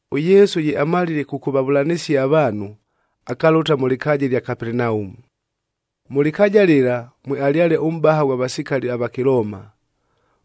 ɄYesu ye amalile kʉkʉvavʉlanɨsia avaanhu, akalʉta mʉ lɨkaaja ɨlya Kapelenaumu. Mʉ lɨkaaja lɨla, mwealyale ʉmʼbaha ghwa vasikali ava Kɨlooma.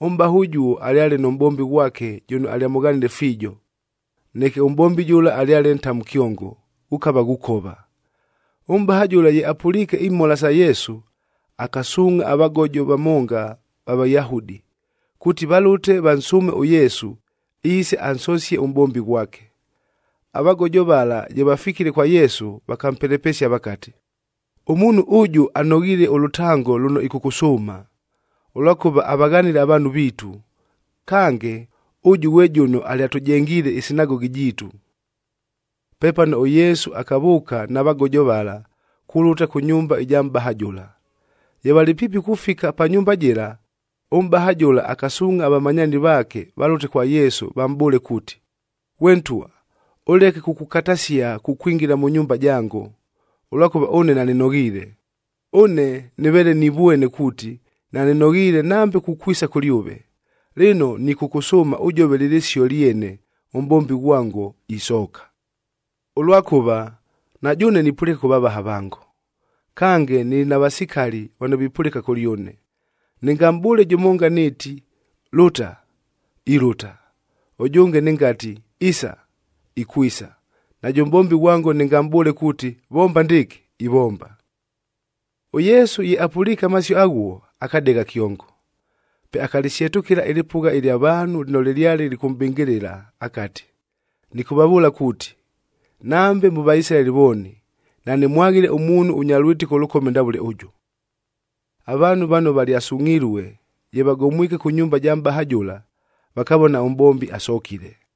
Ʉmʼbaha ʉjuo alyale nʉ mʼbombi ghwake jʉno alyamʉghanile fiijo. Neke ʉmʼbombi jʉla alyale ntamu kyongo, ghʉkava ghukova. Ʉmʼbaha jʉla ye apʉliike imhola sa Yesu, akasuungʼha avagojoa vamonga va Vayahudi, kuuti valʉte vansʉʉme ʉYesu, iise ansosie ʉmʼbombi ghwake. Avagojo vala ye vafikile kwa Yesu, vakampelepesia vakati, “Ʉmuunhu ʉjʉ anoghiile ʉlʉtango lʉno ɨkʉkʉsʉʉma, ʉlwakʉva avaghanile avaanhu viitu. Kange, ʉjʉ ghwe jʉno alyatʉjengiile ɨsinagogi jiitu.” Pepano ʉYesu akavʉʉka na vagojo vala kulʉta kʉ nyumba ɨja mʼbaha jʉla. Ye valɨ piipi kufika pa nyumba jɨla, ʉmʼbaha jʉla akasuungʼha avamanyaani vaake valʉte kwa Yesu vamʼbʉʉle kuuti, “Ghwe Ntwa, ʉleke kukukatasia kukwingila mʉ nyumba jango, ʉlwakʉva ʉne nanɨnoghiile. Ʉne nɨveele nivwene kuuti, nanɨnoghiile nambe kukwisa kʉlyʉve. Lɨno, nɨkʉkʉsʉʉma ʉjove lɨ lɨsio lyene, ʉmʼbombi ghwango, isooka. Ʉlwakʉva, na jʉʉne nipʉlɨka kʉ vavaha vango, kange nɨlɨ na vasikali vano vipʉlɨka kʉlyʉne. Nɨngamʼbʉʉle jʉmonga nɨɨti, ‘Lʉta!’ Ilʉta. Ʉjʉnge, nɨngati, ‘Isa!’ Ikwisa. Najʉ mʼbombi ghwango nɨngamʼbʉʉle kuuti, ‘Vomba ndɨɨkɨ!’ Ivomba.” ɄYesu ye apʉliike amasio aghuo, akadegha kyongo. Pe akalɨsyetʉkɨla ɨlɨpʉgha ɨlya vaanhu lɨno lɨlyale lɨkʉmʼbɨngɨlɨla akati, “Nɨkʉvavʉʉla kuuti, nambe mʉ Vaisilaeli vooni, nanɨmwaghile ʉmuunhu ʉnya lwɨtɨko ʉlʉkome ndavʉle ʉjʉ!” Avaanhu vano valyasungʼhilue, ye vagomwike kʉ nyumba ja mʼbaha jʉla, vakavona ʉmʼbombi asokile.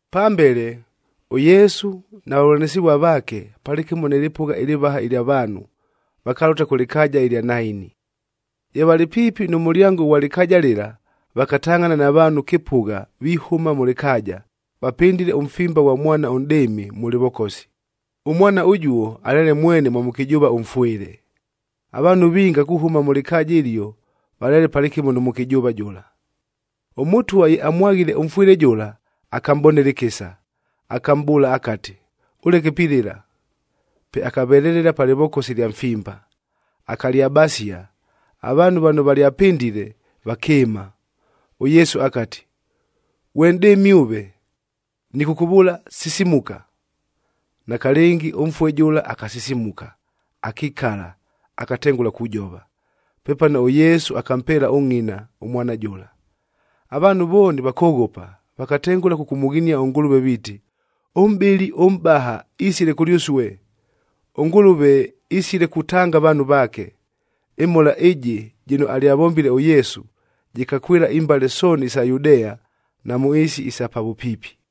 Pambele, ʉYesu na vavʉlanɨsɨvua vaake, palɨkɨmo nɨ lɨpʉgha ɨlɨvaha ɨlya vaanhu vakalʉta kʉ lɨkaaja ɨlya Naini. Ye valɨ piipi nʉ mʉlyango ʉghwa lɨkaaja lɨla, vakatangʼhana na vaanhu kɨpʉgha vihʉma mʉ lɨkaaja, vapɨndile ʉmfimba ghwa mwana ʉnʼdɨɨmi, mʉ lɨvokosi. Ʉmwana ʉjuo, alyale mwene mwa mʉkɨjʉʉva ʉmfwɨle. Avaanhu vinga kuhʉma mʉ lɨkaaja ɨlio, valyale palɨkɨmo nʉ mʉkɨjʉʉva jʉla. ɄMʉtwa ye amwaghile ʉmfwɨle jʉla, akamʼbonela ɨkɨsa. Akamʼbʉʉla akati, “Ʉleke pilɨla.” Pe akavelelela pa lɨvokosi lya mfimba, akalyabasia, avaanhu vano valyapɨndile, vakɨɨma. ɄYesu akati, “Ghwe nʼdɨɨmi ʉve! Nɨkʉkʉvʉʉla, sisimuka!” Nakalɨngi ʉmfue jʉla akasisimuka, akikala, akatengʉla kujova. Pepano ʉYesu akampeela ʉngʼina, ʉmwana jʉla. Avaanhu vooni vakoghopa, vakatengʉla kʉkʉmʉghinia ʉNgʉlʉve viiti, “Ʉmʼbɨli ʉmʼbaha, isile kʉlyʉsue! ɄNgʉlʉve isile kutanga avaanhu vaake!” Ɨmhola ɨjɨ jɨno alyavombile ʉYesu, jɨkakwɨla imbale sooni isa Yudea na mʉ ɨɨsi isa pa vʉpiipi.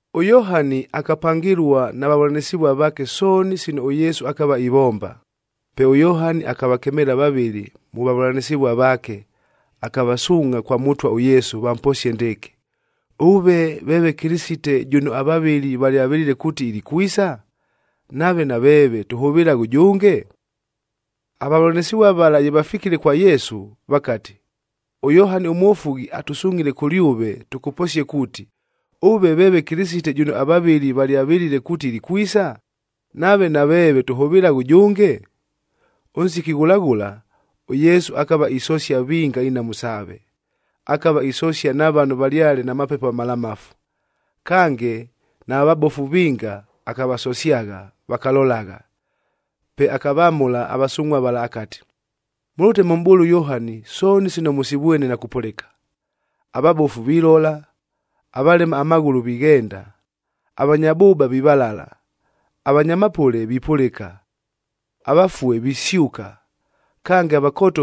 ɄYohani akapangɨlua na vavʉlanɨsɨvua vaake sooni sino ʉYesu akava ivomba. Pe ʉYohani akavakemeela vavɨlɨ mʉ vavʉlanɨsɨvua vaake, akavasuungʼha kwa Mʉtwa ʉYesu vamposie ndɨɨkɨ, “Ʉve veeve Kɨlɨsite jʉno avavɨli valyavɨlile kuuti ilikwisa? Nave naveeve tʉhʉvɨlaghe ʉjʉnge?” Avavʉlanɨsɨvua vala ye vafikile kwa Yesu, vakati, “ɄYohani ʉMwofughi atʉsungʼhile kʉlyʉve tʉkʉposie kuuti, ‘Ʉve veeve Kɨlɨsite jʉno avavɨli valyavɨlile kuuti ilikwisa? Nave naveeve tʉhʉvɨlaghe ʉjʉnge?’” Ʉnsiki ghʉla ghʉla, ʉYesu akava isosia vinga inhamu saave. Akava isosia na vano valyale na mapepo amalamafu. Kange, nava vabofu vinga akavasosyagha, vakalolagha. Pe akavamʉla avasungʼhua vala akati, “Mʉlʉte mʉmʼbʉʉle ʉYohani sooni sino mʉsivwene na kupʉlɨka. Avabofu vilola, avalema amaghʉlʉ vighenda, avanya bʉʉba vivalala, avanya mapʉle vipʉlɨka, avafue visyʉka. Kange,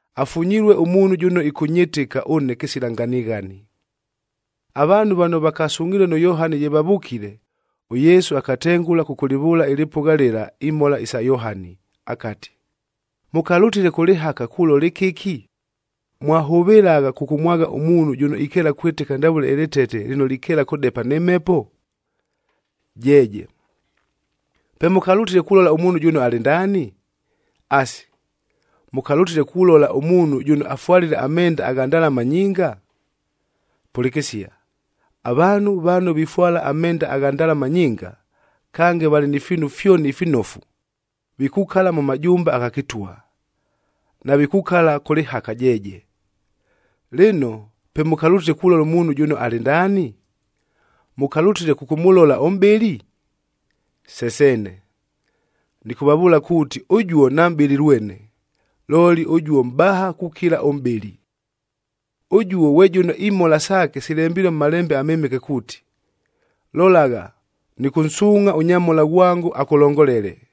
Afunyilue ʉmuunhu jʉno ɨkʉnyɨtɨka ʉne kɨsila nganighani.” Avaanhu vano vakasungʼhilue nʉ Yohani ye vavʉkile, ʉYesu akatengʉla kʉkʉlɨvʉʉla ɨlɨpʉgha lɨla imhola isa Yohani. Akati, “Mʉkalʉtile kʉ lɨhaka, kulola ɨkɨki? Mwahʉvɨlagha kʉkʉmwagha ʉmuunhu jʉno ikeela kwɨtɨka ndavʉle ɨlɨtete lɨno likeela kʉdepa nɨ mhepo? Jeeje! Pe mʉkalʉtile kulola ʉmuunhu jʉno alɨ ndaani? Asi, mʉkalʉtile kulola ʉmuunhu jʉno afwalile amenda agha ndalama nyinga? Pʉlɨkɨsia, avaanhu vano vifwala amenda agha ndalama nyinga, kange valɨ ni fiinu fyoni ifinofu, vikukala mʉ majumba agha kɨtwa, navikukala kʉ lɨhaka jeeje! Lɨno, pe mʉkalʉtile kulola ʉmuunhu jʉno alɨ ndaani? Mʉkalʉtile kʉkʉmʉlola ʉmʼbɨli? Se seene! Nɨkʉvavʉʉla kuuti ʉjuo namʼbɨli lwene, looli ʉjuo mʼbaha kukila ʉmʼbɨli. Ʉjuo ghwe jʉno imhola saake silembilue mʉ Malembe aMɨmɨke kuuti, ‘Lolagha, nɨkʉnsuungʼha ʉnyamhola ghwango akʉlongolele,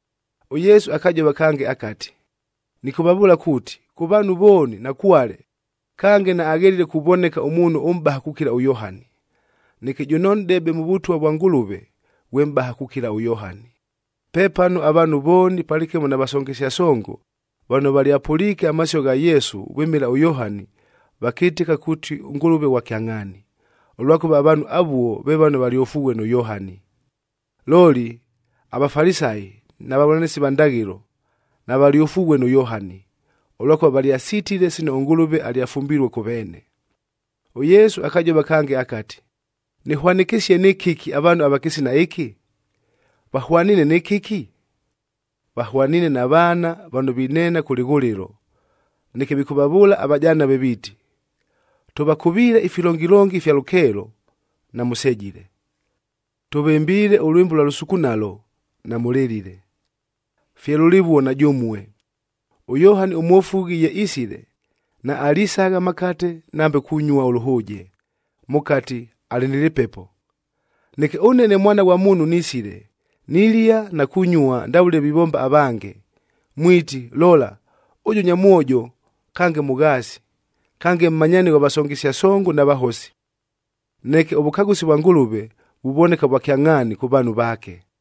ɄYesu akajova kange akati, “Nɨkʉvavʉʉla kuuti, kʉ vaanhu vooni nakwale, kange naaghelile kuvoneka ʉmuunhu ʉmʼbaha kukila ʉYohani. Neke jʉno nʼdebe mʉ Vʉtwa vwa Ngʉlʉve, ghwe mʼbaha kukila ʉYohani.” Pepano avaanhu vooni palɨkɨmo na vasongesia songo, vano valyapʉliike amasio gha Yesu vwɨmɨla ʉYohani, vakɨtɨka kuuti ʉNgʉlʉve ghwa kyangʼhaani. Ʉlwakʉva avaanhu avuo ve vano valyofughue nʉ Yohani. Looli, aVafalisayi na vavʉlanɨsi va ndaghɨlo, navalyofughue nʉ Yohani, ʉlwakʉva valyasitile sino ʉNgʉlʉve alyafumbilue kʉ veene. ɄYesu akajova kange akati, “Nɨhwanɨkɨsie nɨ kɨki avaanhu ava kɨsina ɨkɨ? Vahwaniine nɨ kɨki? Vahwaniine na vaana vano vineena kʉ lɨghʉlɨlo, neke vikʉvavʉʉla avajanave viiti, ‘Tʉvakʉviile ifilongilongi ifya lʉkeelo, namʉsejile! Tʉvɨmbiile ʉlwɨmbo ʉlwa lʉsukunalo, namʉlɨlile!’ “Fye lʉlɨvuo na jʉmue! ɄYohani ʉMwofughi ye isile, naalisagha amakate nambe kunyua ʉlʉhʉʉje,d mʉkati, ‘Alɨ nɨ lɨpepo.’ Neke ʉne, ne Mwana ghwa Muunhu nisile, nilia na kunyua ndavʉle vivomba avange, mwiti, ‘Lola! Ʉjʉ nyamwojo kange mʉghaasi! Kange mmanyaani ghwa vasongesia songo, na vahosi!’ Neke ʉvʉkagʉsi vwa Ngʉlʉve, vuvoneka vwa kyangʼhaani kʉ vaanhu vaake.”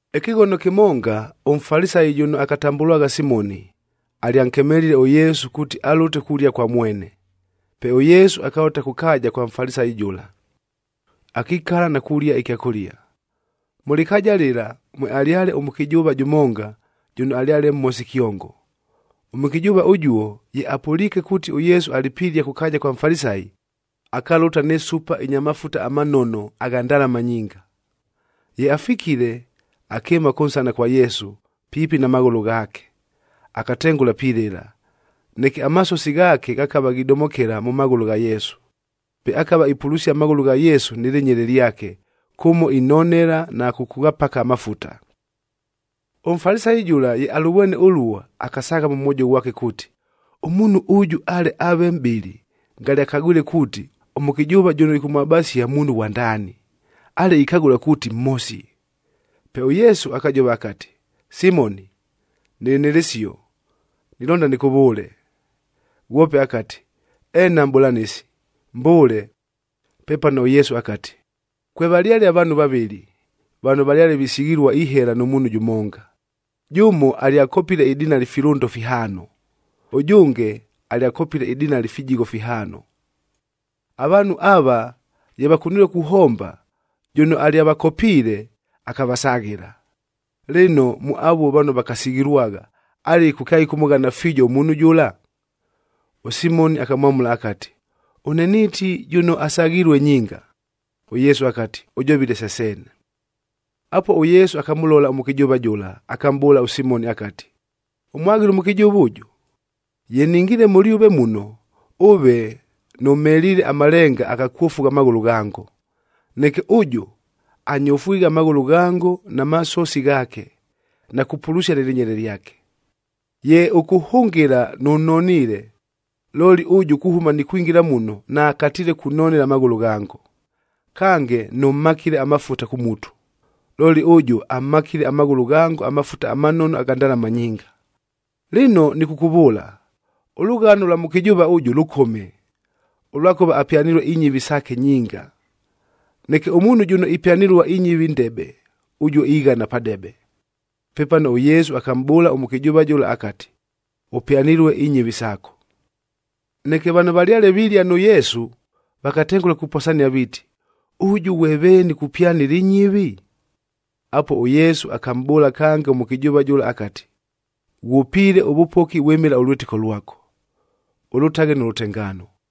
Ɨkɨghono kɨmonga, ʉMfalisayi jʉno akatambʉlwagha Simoni, alyankemelile ʉYesu kuuti alʉte kulia kwa mwene. Pe ʉYesu akalʉta kʉ kaaja kwa Mfalisayi jʉla, akikala na kulia ɨkyakʉlia. Mʉ lɨkaaja lɨla, mwealyale ʉmʉkɨjʉʉva jʉmonga, jʉno alyale mhosi kyongo. Ʉmʉkɨjʉʉva ʉjuo, ye apʉliike kuuti ʉYesu alɨ pilia kʉ kaaja kwa Mfalisayi, akalʉta nɨ supa ɨnya mafuta amanono agha ndalama nyinga. Ye afikile, akɨɨma kʉnsana kwa Yesu, piipi na maghʉlʉ ghaake. Akatengʉla pilɨla, neke amasosi ghaake ghakava ghidomokela mʉ maghʉlʉ gha Yesu. Pe akava ipulusia amaghʉlʉ gha Yesu nɨ lɨnyele lyake, kʉmo inonela na kʉkʉghapaka amafuta. ɄMfalisayi jʉla, ye alʉvwene ʉluo, akasaagha mʉ mwojo ghwake kuuti, “Ʉmuunhu ʉjʉ ale aave mʼbɨli, ngale akagwile kuuti, ʉmʉkɨjʉʉva jʉno ɨkʉmwabasia muunhu ghwa ndaani. Ale ikagʉla kuuti mhosi.” Pe ʉYesu akajova akati, “Simoni, nɨlɨ nɨ lɨsio, nilonda nɨkʉvʉʉle.” Ghwope akati, “Eena Mʼbʉlanɨsi, mbʉʉle.” Pepano ʉYesu akati, “Kwevalyale avaanhu vavɨlɨ, vano valyale visighilua ihela nʉ muunhu jʉmonga. Jʉmo alyakopile idinali ifilʉndo fihaano, ʉjʉnge alyakopile idinali ifijigho fihaano. Avaanhu ava ye vakunilue kuhomba, jʉno alyavakopiile, akavasaghɨla. Lɨno, mʉ avuo vano vakasighilwagha, alɨku kyaɨkʉmʉghana fiijo ʉmuunhu jʉla?” ɄSimoni akamwamʉla akati, “Ʉne niiti jʉno asaghilue nyinga.” ɄYesu akati, “Ʉjovile se seene.” Apuo, ʉYesu akamʉlola ʉmʉkɨjʉʉva jʉla, akamʼbʉʉla ʉSimoni akati, “Ʉmwaghile ʉmʉkɨjʉʉva ʉjʉ? Ye ningiile mʉlyʉve muno, ʉve nʉmheliile amalenga agha kwofugha amaghʉlʉ ghango.e Neke ʉjʉ, anyofwighe amaghʉlʉ ghango na masosi ghaake, na kupulusia nɨ lɨnyele lyake. Ye ʉkʉhʉngɨla, nʉnoniile. Looli ʉjʉ, kuhʉma nikwingila muno, naakatiile kunonela amaghʉlʉ ghango. Kange, nʉmhakile amafuta kʉ mutu,f looli ʉjʉ amhakile amaghʉlʉ ghango amafuta amanono agha ndalama nyinga! Lɨno nɨkʉkʉvʉʉla, ʉlʉghano lwa mʉkɨjʉʉva ʉjʉ lʉkome, ʉlwakʉva apyanilue inyɨvi saake nyinga. Neke ʉmuunhu jʉno ipyanɨlua inyɨvi ndebe, ʉjuo ighana padebe.” Pepano, ʉYesu akamʼbʉʉla ʉmʉkɨjʉʉva jʉla akati, “Ʉpyanilue inyɨvi saako.” Neke vano valyale vilia nʉ Yesu, vakatengʉla kuposania viiti, “Ʉjʉ ghwe veeni kupyanɨla inyɨvi?” Apuo, ʉYesu akamʼbʉʉla kange ʉmʉkɨjʉʉva jʉla akati, “Ghwʉpiile ʉvʉpoki vwɨmɨla ʉlwɨtɨko lwako. Ʉlʉtaghe nʉ lʉtengaano!”